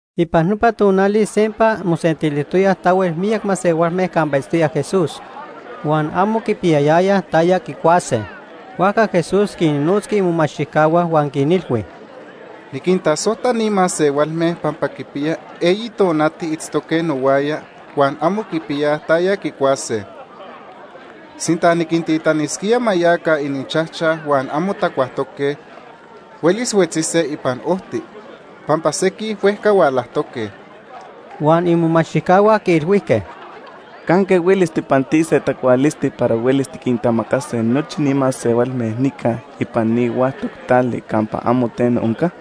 Ipan nopa tonali sempa mosentilijtoyaj tahuel miyac masehualme campa itztoya Jesús. Huan amo quipiyayayaj taya quicuase, huajca Jesús quinnotzqui imomachtijcahua huan quinilhui: ―Niquintasojta ni masehualme pampa quipiya eyi tonati itztoque nohuaya huan amo quipiyaj taya quicuase. Sinta niquintitanisquía ma yaca ininchajchaj huan amo tacuajtoque, huelis huetzise ipan ojti, pampa sequij huejca hualajtoque. Huan imomachtijcahua quiilhuijque: ―¿Canque huelis tijpantise tacualisti para huelis tiquintamacase nochi ni masehualme nica ipan ni huactoc tali campa amo teno onca?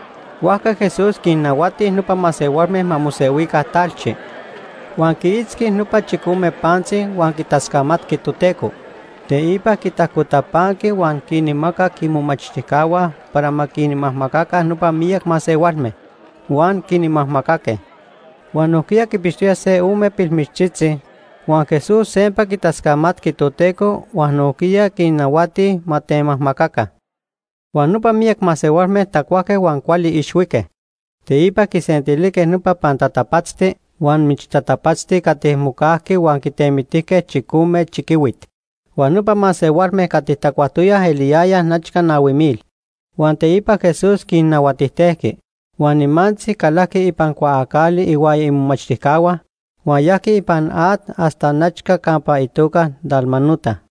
Huajca Jesús quinnahuati nopa masehualme ma mosehuica talchi. Huan quiitzqui nopa chicome pantzi huan quitascamatqui Toteco. Teipa quitajcotapanqui huan quinmacac imomachtijcahua para ma quinmajmacaca nopa miyac masehualme. Huan quinmajmacaque. Huan nojquiya quipixtoyaj se ome pilmichtzitzi, huan Jesús sempa quitascamatqui Toteco huan nojquiya quinnahuati ma temajmacaca. Huan nopa miyac masehualme tacuajque huan cuali ixhuique. Teipa quisentilijque nopa pantatapatzti huan michtatapatzti cati mocajqui huan quitemitijque chicome chiquihuit. Huan nopa masehualme cati tacuajtoyaj eliyayaj nechca nahui mil. Huan teipa Jesús quinnahuatijtejqui. Huan nimantzi calajqui ipan cuaacali ihuaya imomachtijcahua, huan yajqui ipan at hasta nechca campa itoca Dalmanuta.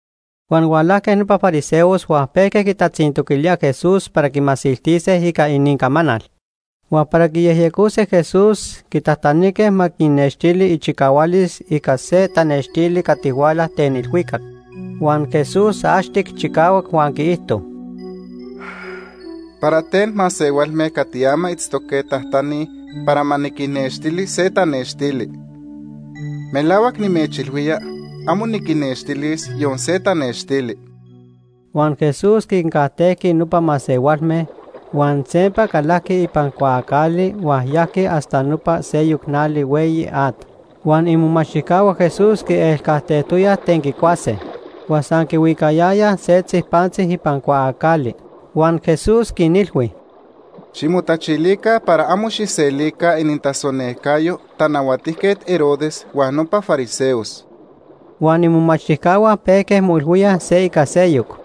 Huan hualajque nopa fariseos huan pejque quitatzintoquilíaj Jesús para quimasiltise ica inincamanal. Huan para quiyejyecose Jesús, quitajtanijque ma quinnextili ichicahualis ica se tanextili cati huala ten ilhuicac. Huan Jesús axtic chicahuac huan quiijto: ―¿Para ten masehualme cati ama itztoque tajtanij para ma niquinnextili se tanextili? Melahuac nimechilhuía amo niquinnextilis yon se tanextili. Huan Jesús quincajtejqui nopa masehualme, huan sempa calajqui ipan cuaacali huan yajqui hasta nopa seyoc nali hueyi at. Huan imomachtijcahua Jesús quielcajtejtoyaj ten quicuase, huan san quihuicayayaj setzi pantzi ipan cuaacali. Huan Jesús quinilhui: ―Ximotachilica para amo xijselica inintasonejcayo Tanahuatijquet Herodes huan nopa fariseos. Huan imomachtijcahua pejque moilhuíaj se ica seyoc: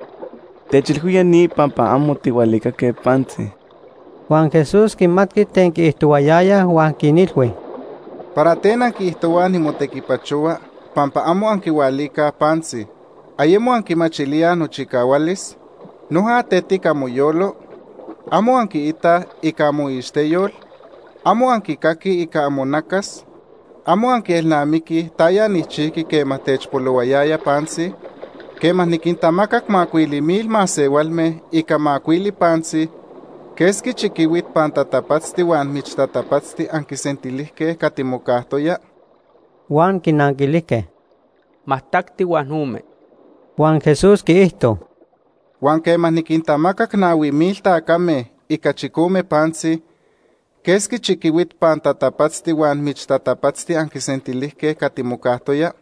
“Techilhuía ni pampa amo tijhualicaque pantzi.” Huan Jesús quimatqui ten quiijtohuayayaj huan quinilhui: ―¿Para ten anquiijtohuaj nimotequipachohua pampa amo anquihualicaj pantzi? ¿Ayemo anquimachilíaj nochicahualis? ¿Noja tetic amoyolo? ¿Amo anquiitaj ica amoixteyol? ¿Amo anquicaquij ica amonacas? ¿Amo anquielnamiquij taya nijchijqui quema techpolohuayaya pantzi? Quema niquintamacac macuili mil masehualme ica macuili pantzi, ¿quesqui chiquihuit pantatapatzti huan michtatapatzti anquisentilijque cati mocajtoya? Huan quinanquilijque: ―Majtacti huan ome. Huan Jesús quiijto: ―Huan quema niquintamacac nahui mil tacame ica chicome pantzi, ¿quesqui chiquihuit pantatapatzti huan michtatapatzti anquisentilijque cati mocajtoya?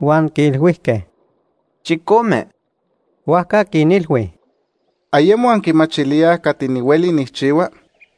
Huan quiilhuijque: ―Chicome. Huajca quinilhui: ―¿Ayemo anquimachilíaj cati nihueli nijchihua?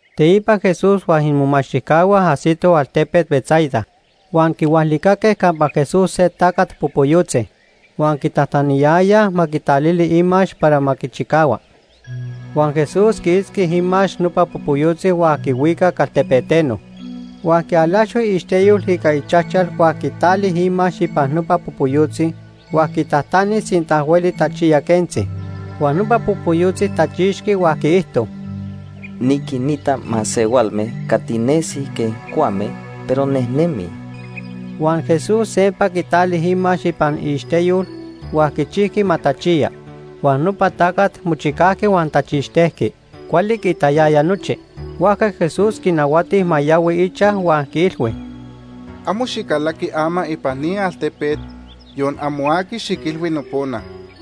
Teipa Jesús huan imomachtijcahua ajsitoj altepet Betsaida. Huan quihualicaque campa Jesús se tacat popoyotzi. Huan quitajtaniyayaj ma quitalili imax para ma quichicahua. Huan Jesús quiitzqui imax nopa popoyotzi huan quihuicac altepeteno. Huan quialaxo iixteyol ica ichajchal huan quitali imax ipan nopa popoyotzi huan quitajtani sinta hueli tachiya quentzi. Huan nopa popoyotzi tachixqui huan quiijto: ―Niquinita masehualme cati nesij quej cuame, pero nejnemij. Huan Jesús sempa quitali imax ipan iixteyol huan quichijqui ma tachiya. Huan nopa tacat mochicajqui huan tachixtejqui. Cuali quiitayaya nochi. Huajca Jesús quinahuati ma yahui ichaj huan quiilhui: ―Amo xicalaqui ama ipan ni altepet yon amo aqui xiquilhui nopona.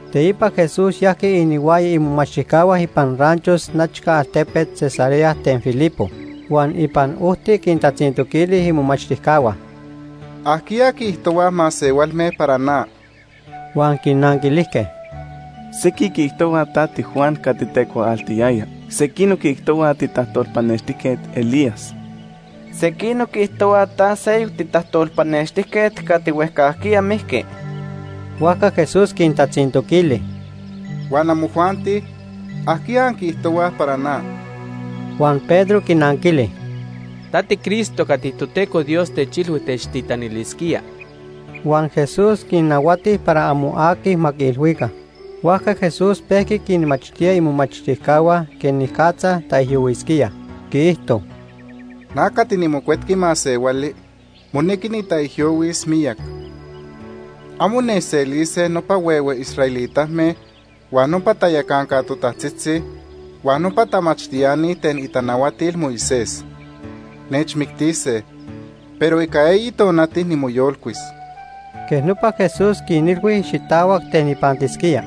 Teipa Jesús yajqui inihuaya imomachtijcahua ipan ranchos nechca altepet Cesarea ten Filipo. Huan ipan ojti quintatzintoquili imomachtijcahua: ―¿Ajquiya quiijtohuaj masehualme para na? Huan quinanquilijque: ―Sequij quiijtohuaj ta tiJuan cati tecuaaltiyaya. Sequinoc quiijtohuaj titajtolpanextijquet Elías. Sequinoc quiijtohuaj ta seyoc titajtolpanextijquet cati huejcajquiya mijqui. Huajca Jesús quintatzintoquili: ―Huan amojuanti, ¿ajquiya anquiijtohuaj para na? Huan Pedro quinanquili: ―Ta tiCristo cati Toteco Dios techilhui techtitanilisquía. Huan Jesús quinnahuati para amo aqui ma quiilhuica. Huajca Jesús pejqui quinmachtía imomachtijcahua quenicatza taijyohuisquía. Quiijto: ―Na cati niMocuetqui Masehuali monequi nitaijyohuis miyac. Amo nechselise nopa huehue israelitame, huan nopa tayacanca totajtzitzi, huan nopa tamachtiani ten itanahuatil Moisés. Nechmictise, pero ica eyi tonati nimoyolcuis. Quej nopa Jesús quinilhui xitahuac ten ipantisquía.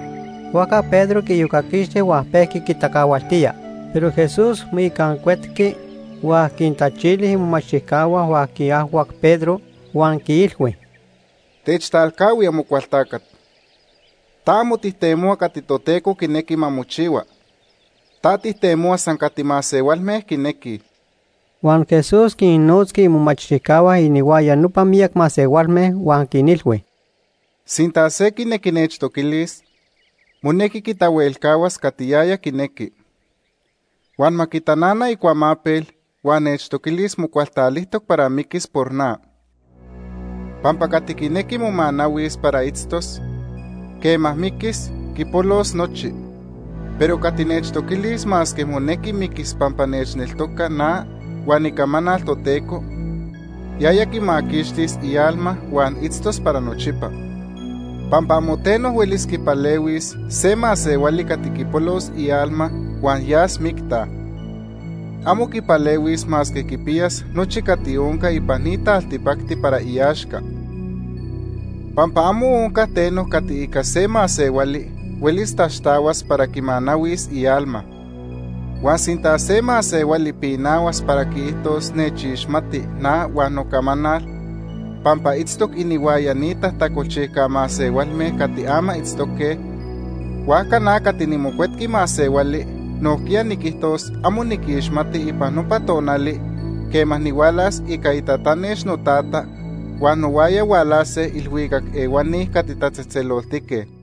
Huajca Pedro quiiyocaquixti huan pejqui quitacahualtía. Pero Jesús moicancuetqui huan quintachili imomachtijcahua huan quiajhuac Pedro, huan quiilhui: ―Techtalcahui, Amocualtacat. Ta amo tijtemohua cati Toteco quinequi ma mochihua, ta tijtemohua san cati masehualme quinequij. Huan Jesús quinnotzqui imomachtijcahua inihuaya nopa miyac masehualme, huan quinilhui: ―Sinta se quinequi nechtoquilis, monequi quitahuelcahuas cati yaya quinequi. Huan ma quitanana icuamapel huan nechtoquilis mocualtalijtoc para miquis por na. Pampa cati quinequi momanahuis para itztos, quema miquis, quipolos nochi. Pero cati nechtoquilis masque monequi miquis pampa nechneltoca na huan icamanal Toteco, yaya quimaquixtis ialma huan itztos para nochipa. Pampa amo teno huelis quipalehuis se masehuali cati quipolos ialma huan yas micta. Amo quipalehuis masque quipiyas nochi cati onca ipan ni taltipacti para iaxca. Pampa amo onca teno cati ica se masehuali huelis taxtahuas para quimanahuis ialma. Huan sinta se masehuali pinahuas para quiijtos nechixmati na huan nocamanal, pampa itztoc inihuaya ni tajtacolchijca masehualme cati ama itztoque, huajca na cati niMocuetqui Masehuali nojquiya niquijtos amo niquixmati ipan nopa tonali quema nihualas ica itatanex noTata huan nohuaya hualase ilhuicac ehuani cati tatzejtzeloltique.